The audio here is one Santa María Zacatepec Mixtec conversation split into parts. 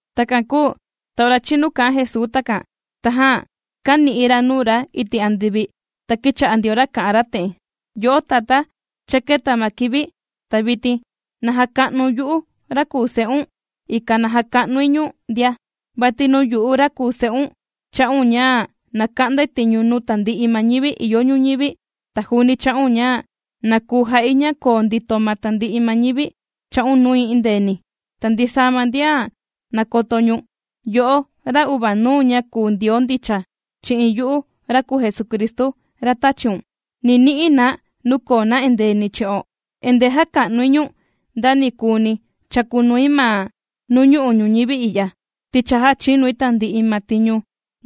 Takan kūu ta ora chīnu kā'an Jesuu takan, tajan kāni'i ra nuu ra iti' andivi, ta kīcha'a ndio ra kà'an ra te'en: ―Yo'o Tatá, cha kēta ma kivi. Ta vitin na jaka'nu̱n yu'u ra kùu Se'un, ikan na jaka'nui ñu̱n ndia. Vati nuu yu'u ra kùu Se'un, chā'un ña na ka'ndai tiñu nuu tandi'i ma ñivi ìyo ñuñivi, ta juuni chā'un ña na kuu ja'i ña koo ndito ma tandi'i ma ñivi chā'un nui endeeni. Ta ndisaa ma ndian nàkoto ñu̱n, yo'o ra uvanuu ña kùu Ndioo ndicha, chi'in yu'u ra kùu Jesucristu ra tāchiun, ni ni'i na nuu koo na endeeni chi'o. ’Endee jàka'nui ñu̱n nda ni kùuni chàkunui ma nuu ñu'u' ñuñivi i'ya, ti cha jāchinui tandi'i ma tiñu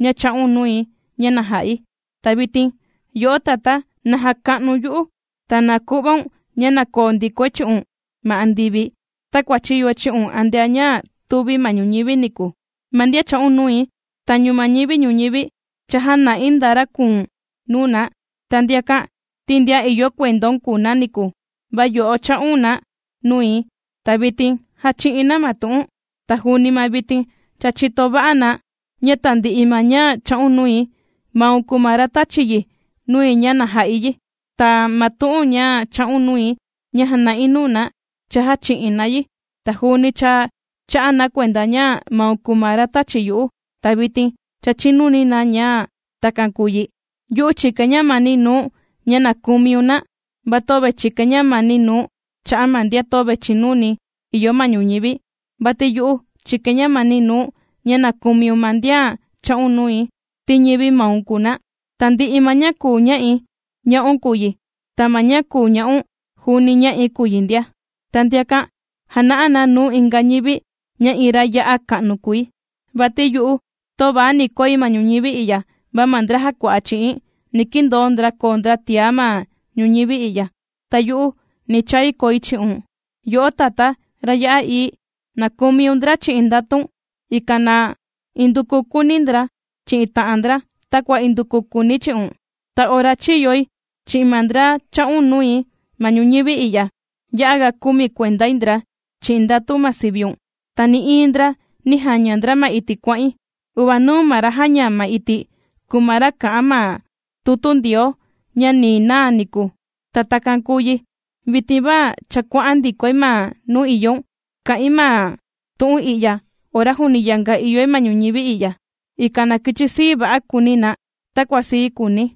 ña chā'un nui ña na ja'i. Ta vitin yo'o Tatá, na jaka'nu̱n yu'u, ta na ku'vaun ña na koo ndikoi chi'un ma andivi, takua chīyoi chi'un antea ña tūvi ma ñuñivi niku. ’Ma ndian chā'un nui, tañu ma ñivi ñuñivi, cha jāna'i nda ra kùu̱n nuu na. Ta ndiakan, ti ndian ìyo kuendaun kùu na niku, va yo'o chā'un na nui, ta vitin jàchi'in na ma tu'u̱n. Ta juuni ma vitin cha chìto va'a na, ña tandi'i ma ña chā'un nui, maun kùu ma ra tāchi yi nui ña na ja'i yi. Ta ma tu'un ña chā'un nui ña jàna'i nuu na, cha jāchi'in na yi. Ta juuni cha chā'a na kuenda ña maun kùu ma ra tāchi yu'u, ta vitin cha chìnuni na ña takan kùu yi. ’Yu'u chìkain ñamani nuu̱n ña na kumiun na, va töve chìkain ñamani nuu̱n cha'a' ma ndian töve chìnuni ìyo ma ñuñivi, vati yu'u chìkain ñamani nuu̱n ña na kumiun ma ndian chā'un nui, ti ñivi maun kùu na. Tandi'i ma ña kùu ña'i, ña'un kùu yi, ta ma ña kùu ña'un, juuni ña'i kùu yi ndia. Ta ndiakan, jàna'a na nuu inga ñivi ña iin ra ya'a ka'nu kùi. ’Vati yu'u, töva ni koi ma ñuñivi i'ya, va ma ndra jàkua'a chi'i̱n, ni kindoo ndra koo ndra tiá ma ñuñivi i'ya, ta yu'u ni chai koi chi'un. Yo'o Tatá ra ya'a ií, na kumiun ndra chi'in ndatun, ikan na induku kuuni ndra chi'in ta'an ndra, takua induku kùuni̱ chi'un. Ta ora chīyoi chi'in ma ndra chā'un nui ma ñuñivi i'ya, ya'a ga kumi kuendai ndra chi'in ndatu ma siviun, ta nï'iin ndra nī jaña ndra ma iti' kuà'in. Uvanuu ma ra jāña ma iti̱', kùu ma ra kà'an ma tutu Ndioo ña ni naa niku. Ta takan kūu yi. ’Vitin va cha kuà'an ndikoi ma nuu ìyoun. Kà'in ma tu'un i'ya ora juuni yanga ìyoi ma ñuñivi i'ya, ikan na kichi sii va'a kuuni na, takua sii kùuni̱.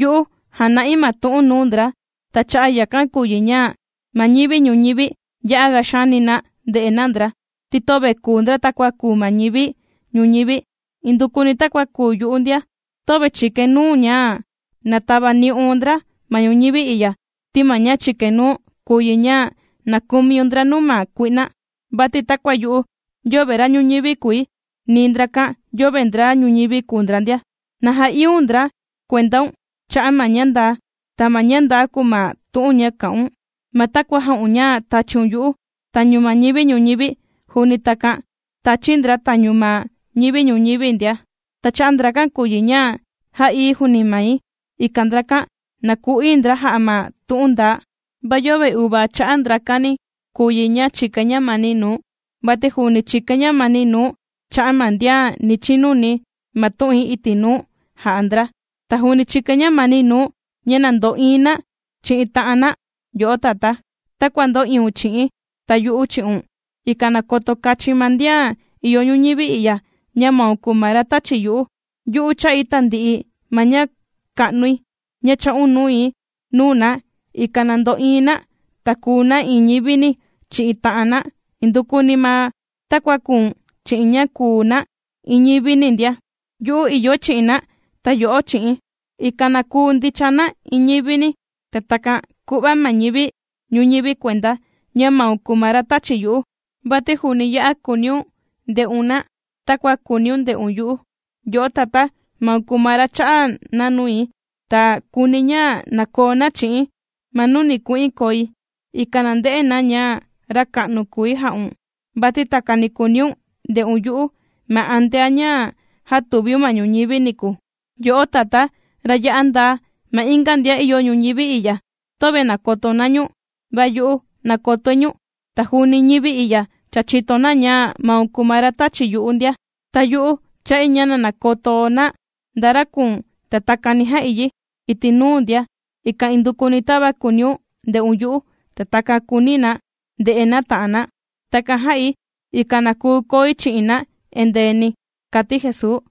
Yu'u jàna'i ma tu'u̱n nuu ndra, ta cha'a' yakan kùu yi ña ma ñivi ñuñivi ya'aga xaani na ndè'e na ndra, ti töve kùu ndra takua kùu ma ñivi ñuñivi, indukuni takua kùu yu'u ndia. Töve chìkain nuu̱n ña na tavani'un ndra ma ñuñivi i'ya, ti ma ña chìkain nuu̱n, kùu yi ña na kumiun ndra nuu ma kui'na. Vati takua yu'u, yöve ra ñuñivi kùi, ni ndrakan yöve ndra ñuñivi kùu ndra ndia. Na ja'iíun ndra kuendaun cha'a' ma ña ndaa. Ta ma ña ndaa kùu ma tu'un ña kà'un. Ma takua jā'un ña tāchiun yu'u tañu ma ñivi ñuñivi, juuni takan tāchi̱ ndra tañu ma ñivi ñuñivi ndia. Ta cha'a' ndrakan kùu yi ña jā'íi̱ juuni mai, ikan ndrakan, na ku'ií ndra jà'a ma tu'un ndaa. ’Va yöve uvaa cha'a' ndrakan ni kùu yi ña chìkain ñamani nuu̱n, vati juuni chìkain ñamani nuu̱n cha'a' ma ndian ni chinuni ma tu'in iti' nuu jà'a ndra. Ta juuni chìkain ñamani nuu̱n ña na ndo'iin na chi'in ta'an na, yo'o Tatá, takua ndō'iun chi'i̱n, ta yu'u chi'un, ikan na koto kachin ma ndian ìyo ñuñivi i'ya, ña maun kùu ma ra tāchi yu'u. Yu'u chā'i tandi'i ma ña ka'nui, ña chā'un nui, nuu na, ikan na ndo'iin na, ta kùu na iin ñivini chi'in ta'an na, indukuni ma takua kùu̱n chi'i̱n ña kùu na iin ñivini ndia. Yu'u ìyoi chi'in na, ta yo'o chi'i̱n, ikan na kuu ndicha na iin ñivini, ta takan ku'va ma ñivi ñuñivi kuenda, ña maun kùu ma ra tāchi yu'u. Vati juuni ya'a kùuniun nde'un na takua kùuniun nde'un yu'u. ’Yo'o Tatá, maun kùu ma ra chā'a na nui, ta kùuni̱ ña na koo na chi'i̱n ma nuu ni ku'in koi, ikan na nde'e na ña ra ka'nu kùi jā'un, vati takani kùuniun nde'un yu'u ma antea ña jātuviun ma ñuñivi niku. Yo'o Tatá, ra ya'a ndaa, ma inga ndian ìyo ñuñivi i'ya, töve nàkoto na ñu̱n, va yu'u nàkotoi ñu̱n, ta juuni ñivi i'ya cha chìto na ña maun kùu ma ra tāchi yu'u ndia. Ta yu'u chà'i ña na nakoto na nda ra kùu̱n, ta takan ni ja'i yi iti' nuu ndia, ikan indukuni tava kùuniun nde'un yu'u, ta takan kuuni na nde'e na ta'an na. Takan jā'i, ikan na kuu koi chi'in na endeeni ―kàti Jesuu.